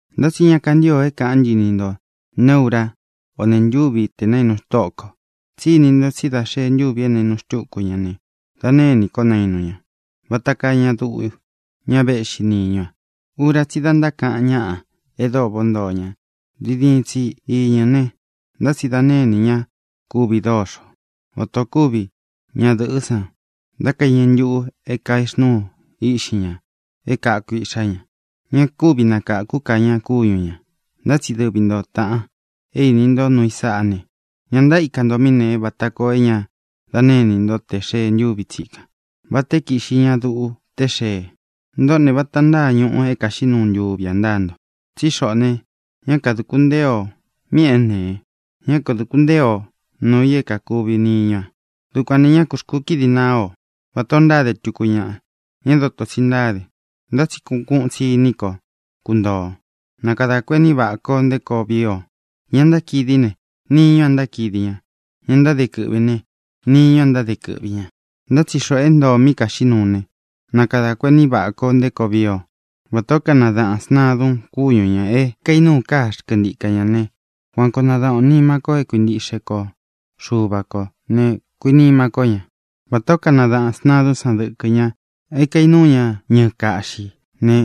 Ntá tsi ñá kantīo é kāʼán ntɨ ni ntō neé urá o nēe ntúvi te nainu Tóʼo kō, tsí ini nto tsí dā xeé ntuvi é naīnu xtúku ña ne, da née inī kó nainu ña, vata kaa ña duʼu, ña véʼxi niñú a. Ura tsí i da ntákaʼan ñáʼa e dóo váʼā o ntoo ña, diin diin tsi iñɨ ne, ntá tsi da née inī ñá kuvi dóxo, vatā ó kuvi ñadɨ̄ʼɨ́ san dá kaiñɨ ntuʼu kaexnúu iʼxí ña é kāku iʼxá ña. Ña kúvi nakākú ka ña kúñu ñā. Ntá tsi dɨvi nto, tāʼan, é īni ntó nuu i sáʼā ne, ña ntaíka nto míʼī é nēe vata koo é ña da née inī ntó tē xee ntúvi tsīkan, vatā é kiʼxi ña duʼu té xee. Ntoʼó ne, vata ntáa ñuʼu é kāxiʼí nuu ntuvi ā ntáa nto; tsí xoʼō ne, ñá kadūku ntée ō míʼī é nēe; ñá kadūku ntée o nūu i é kākuvi niñú a. Dukuān ne, ñá kū xkukídi naá o vatā o ntáde tuku ñaʼa, ña é dotō tsi ntáde, ntá tsi kuʼun kuʼun tsi iní ko kuntoo ō. Na kadā kuení vaʼā ko nté koo vii o. Ña ntákidi ne, niñú a ntákidi ña. Ña ntáde kɨʼvī ne, niñú a ntáde kɨʼvi ñā. Ntá tsi xoʼō é ntoo ō mí kaxiʼí nuu ne, na kadā kuení vaʼā ko nté koo vii o. Vatā ó kanadaʼān sntadun kúñu ñā é kaīnúu káa xkɨntika ñā né, kuan koo nadaʼan ō nima ko é kuintiʼxe ko Xuva kō ne, kuinima ko ña. Vatā ó kanadaʼān sntadún san dɨkɨ ña é kainuu ña ñɨɨ kaʼxī né,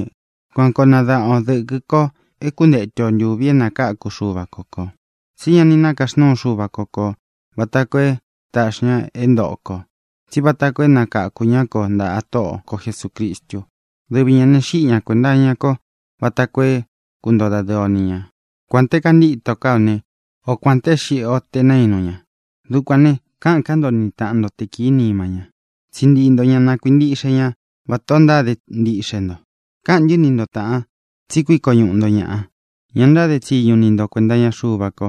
kuan koo nadaʼan o dɨ̄kɨ ko é kuntetu o ntūvi é nakākú Xuva ko kō. Tsi ñá ni nākaxnúu Xuva ko kō vata koo é taʼxi ña kō é ntōʼo ko, tsí vata koo é nakakū ñá ko ntāʼa Tóʼo ko Jesūcristu. Dɨvi ñā ne, xíʼi ña kuēnta iña kó vata koo é kuntoo dadɨɨ o ni ña, kuān té kantítō ká o ne, o kuān té e xíʼi o tē naínu ña. Dukuān ne, káʼān ká nto ni tāʼan ntó te kīí nima ña. Tsiʼi ntii nto ña na kuīntiʼxe ñá vatā o ntáde ntiʼxe nto. Káʼān ntɨ́ ni nto, tāʼan, tsí kuiko ñuʼu nto ñāʼa, ña ntáde tsiñu niʼi nto kuēnta iña Xuva ko,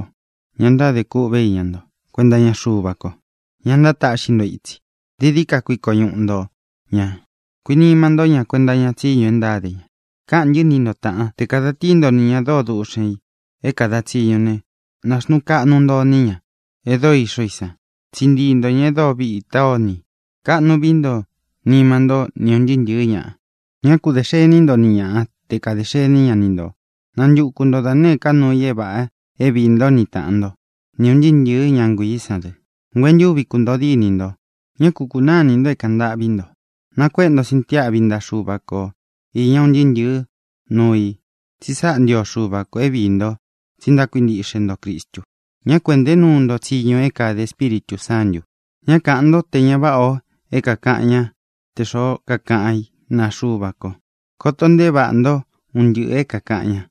ña ntádē kûʼvé iña nto kuenta iña Xuva ko, ña ntátaʼxi nto ítsi. Dií dií ka kuiko ñuʼu nto ñā; kuinima ntó ña kuenta iña tsiñu e ntáde ña. Káʼān ntɨ́ ni nto, tāʼán, te kāda tíi nto nī ña dóo duʼxen ī é kāda tsiñu ne, nāxnuu kaʼnu nto iní ña e dóo ixó i san. Tsiʼi ntii nto ñā e dóo vitá o ini i. Kaʼnu vií nto nima ntó ni ūn ntɨɨ́ ntɨ̄ɨ́ ñaʼa. Ñá ku dē xení nto ni ñaʼa te kadē xení ña ni ntō. Nantuku nto da nēé ka nuu i é vāʼa é viī ntó ni tāʼan ntó, ni ūn ntɨɨ́ ntɨ̄ɨ́ ña nguiī sán dɨ. Nguentúvi kuntōo dínī nto. Ñá ku kūnáa inī nto é kāʼan ntâʼví nto. Nakuéʼe nto sintiáʼvi ntaʼa Xuva ko īña un ntɨɨ́ ntɨ̄ɨ́ nuu i, tsi sáʼa ntio Xuva kō é viī nto tsi ntákuintiʼxe nto Cristu. Ñá ku ēʼnté nuu nto tsiñu é kāde Espíritū Sántū. Ñá kāʼan ntó te ña váʼā o é kākaʼan ñáʼa tē xoó kakaʼan í naa Xuva ko. Koto nteé vaʼā ntó un ntɨʼɨ̄ é kākaʼan ñá,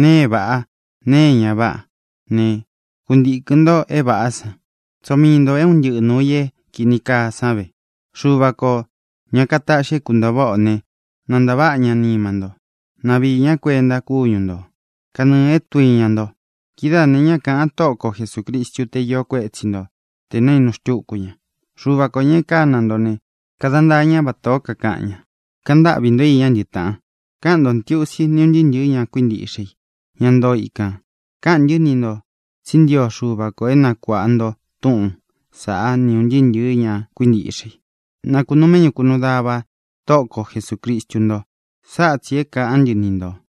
nēe é vāʼá, nēe é ña váʼa ne, kuntīkɨn nto é vāʼá san. Tsoo mii ntō é un ntɨʼɨ nūu i é kīni kaa san ve. Xuva kō, ña kataʼxi é kuntōo váʼa ō né, na ntāváʼa ña nima nto. Na viī ñá kuenta kúñu nto, kanɨɨ̄ é tduiña nto. Kidáā ne, ñá kāʼan Tóʼo ko Jesūcristu té iō kuetsí nto tē naínu xtúku ña. Xuva kō, ña e kána nto ne, kada ntaa ñá vatā ó kakaʼan ña. Kaʼan ntáʼvī ntó iñá ntɨ, taʼan. Káʼan ntō ntiusi ni ún ntɨɨ́ ntɨ̄ɨ́ ña kuíntiʼxe i, ña ntoo ikān. Káʼān ntɨ́ ni ntō tsí ntio Xuva kō é nakuāʼa nto túʼūn saʼá ni ūn ntɨɨ́ ntɨ̄ɨ́ ña kuíntiʼxe i. Na kūnuu méʼñu kūnuu dava Tóʼo ko Jesūcristu nto. Sáʼa tsī é kāʼán ntɨ ni ntō.